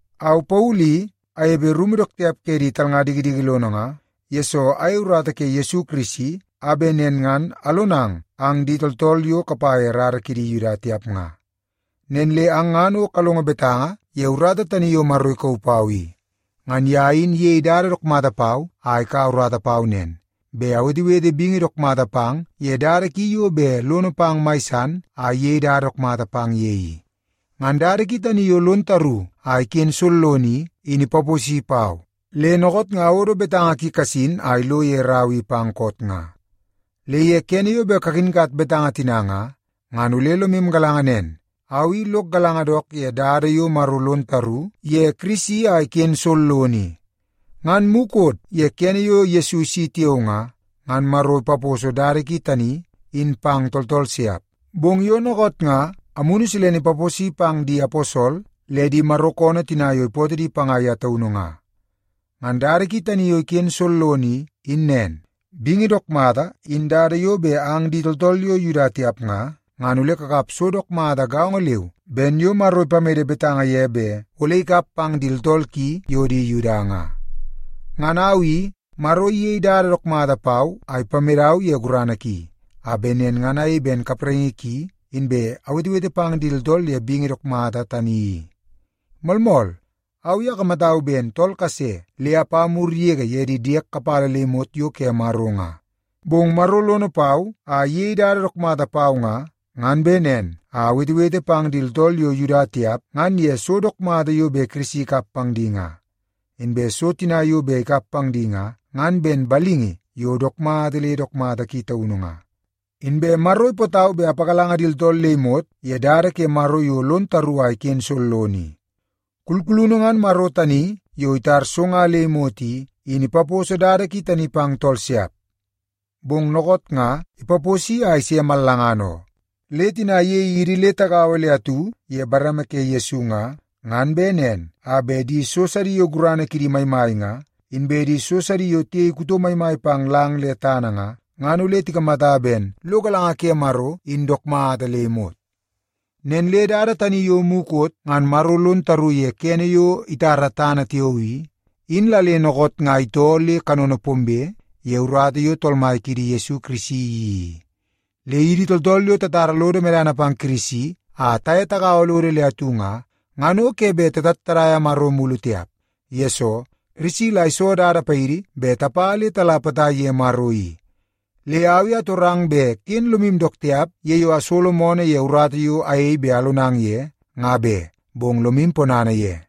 Au, Paulu i, anepe rumu dook tiap ke di talnga dikidiki lono nga, yesoo ayei urata ke Yesu Kirisi a bet nen ngan alonang ang di tooltool yo kapa ye rara ke di Yuda tiap nga. Nen le ang ngan o kalongo betanga ye urata tani yo Maro ikauu pau i. Ngan ye in iyei dada dook mata pau a ikaua urata pau nen, bet awetewete bingi dook mata pang ye dada ki yo bet lono pang mai san a iyei dada dook mata pang ye i. Ngan dada ki tani yo lon taru a iken sollono i, in ipaposi pau, le dookoot nga awodo betanga ki kasin a ilo ye rau i pang koot nga. Le ye kene yo bet kakinkat betanga tina nga, ngan ole lomu galanga nen, au i lok galanga dook ye dada yo Maro lon taru ye Kirisi a iken sollono i. Ngan mukot ye kene yo Yesu isi tiao nga, ngan Maro ipaposo dada ki tani in pang tooltool siap. Bong yo dookoot nga Amunu Silene ipaposi pang di aposol le di Maro koonoo tina yo ipootoo di panga ye taunu nga. Ngan dada ki tani yo iken sollono i, in nen: Bingi dook mata in dada yo bet ang di tooltool yo Yuda tiap nga, ngan ole kakap so dook mata gaongo leu ben yo Maro ipamede betanga ye bet ole ikap pang di tooltool ki yo di Yuda nga. Ngan au i, Maro iyei dada dook mata pau a ipamedau ye gurana ki, a bet nen ngan ayei ben kapraingi ki, inbe awetewete pang di tooltool ye bingi dook mata tani i. Moolmool, au i akamatau ben tool kase le apa mur yege ye di diek kapala le imot yo ke Maro nga. Bong Maro lono pau a iyei dada dook mata pau nga, ngan bet nen a awetewete pang di tooltool yo Yuda tiap ngan ye so dook mata yo bet Kirisi ikap pang di nga. Inbe so tina yo bet ikap pang di nga, ngan ben balingi yo dook mata le dook mata ki taunu nga. Inbe Maro ipootau bet apagalanga di tooltool le imot ye dada ke Maro yo lon taru a iken sollono i. Kulkulunu ngan Maro tani yo itar so nga le imot i, in ipaposo dada ki tani pang tooltool siap, bong dookoot nga ipaposi a ise mallangana oo. Le tina iyei di le tigaua le atu ye bareme ke Yesu nga, ngan bet nen a bet di so sidi yo gurana kidi maimai nga, inbe di so sidi yo tiyei kuto maimai pang lang le tana nga, ngan ole tikamata ben lo galanga ke Maro in dook mata le imot. Nen le dada tani yo mukot ngan Maro lon taru ye kene yo itara tana tiao i, in la dookoot nga itoo le kanono pombe ye urata yo Tool Mai kiidi Yesu Kirisi iyeii i. Le idi tooltool yo tatara lodo medana pang Kirisi a taye tagaua lodo le atu nga, ngan o ke bet tatattadaia Maro mulu tiap. Yesoo, Kirisi la iso dada paidi bet tapa le tala potai ye Maro i. Le au i atorang bet ken lomu dook tiap ye yo asolo moonoo ye urata yo ayei bet alonang ye, nga be, bong lomu ponana ye.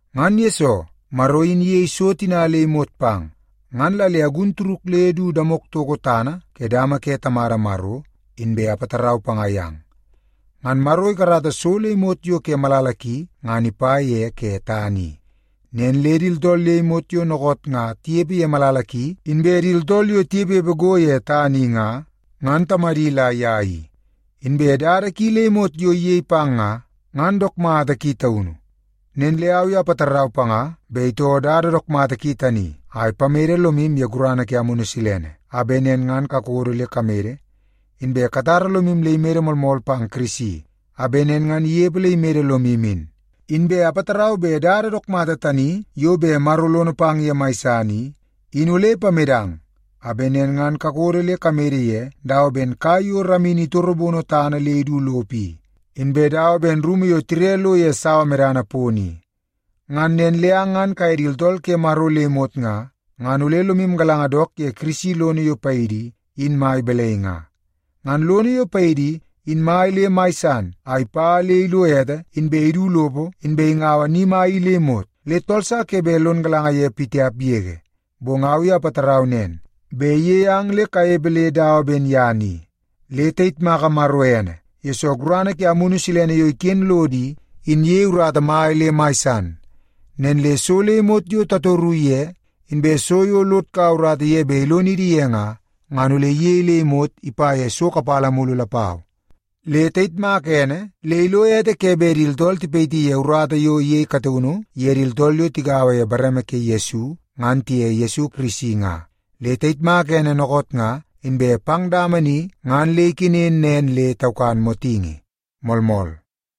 Ngan yesoo Maro in iyei so tina le imot pang, ngan la le agun turuk le du damok toko tana ke dama ke Tamada Maro, inbe apatarau panga yang. Ngan Maro ikarata so le imot yo ke malala ki ngan ipa ye ke tana i. Nen le di tooltool le imot yo dookoot nga tinepe ye malala ki inbe di tooltool yo tinepepe go ye tana i nga, ngan Tamadi la ye i. Inbe dada ki le imot yo iyei pang nga, ngan dook mata ki taunu. Nen le au i apatarau panga bet itoo dada dook mata ki tani a ipamede lomu ye gurana ke Amunu Silene a bet nen ngan kakodo le kamede, inbe katara lomu le imede moolmool pang Kirisi, a bet nen ngan inepe le imede lomu in. Inbe apatarau bet dada dook mata tani yo bet Maro lono pang ye mai san i, in ole ipamedang a bet nen ngan kakodo le kamede ye dawa ben kai yo ramini itorobono tana le idu lopo i, inbe dawa ben rumu yo tire lo ye sawa medana pono i. Ngan nen le ang ngan kaye di tooltool ke Maro le imot nga, ngan ole lomu galanga dook ye Kirisi lono yo paidi i, in mai balai nga. Ngan lono yo paidi i, in mai le mai san a ipa le ilo ete inbe idu lopo inbe ingaua ni mai i le imot, le tool sa ke bet lon galanga ye pitiap yege. Bong au i apatarau nen, bet iyei ang le kanepe le dawa ben ye ni. Le tayitmaka Maro ene, yesoo gurana ke Amunu Silene yo iken lodo i, in iyei urata mai le mai san. Nen le so le imot yo tatoru ye, inbe so yo lod kaua urata ye bet ilonidi ye nga, ngan ole iyei le imot ipa ye so kapala mulu lapau. Le tayitmaka ene le ilo ete ke bet di tooltool tipayiti ye urata yo iyei kataunu ye di tooltool yo tigaua ye bareme ke Yesu ngan tiye Yesu Kirisi nga. Le tayitmaka ene dookoot nga inbe pang dama ni ngan le ikenen nen le taukan motingi. Moolmool.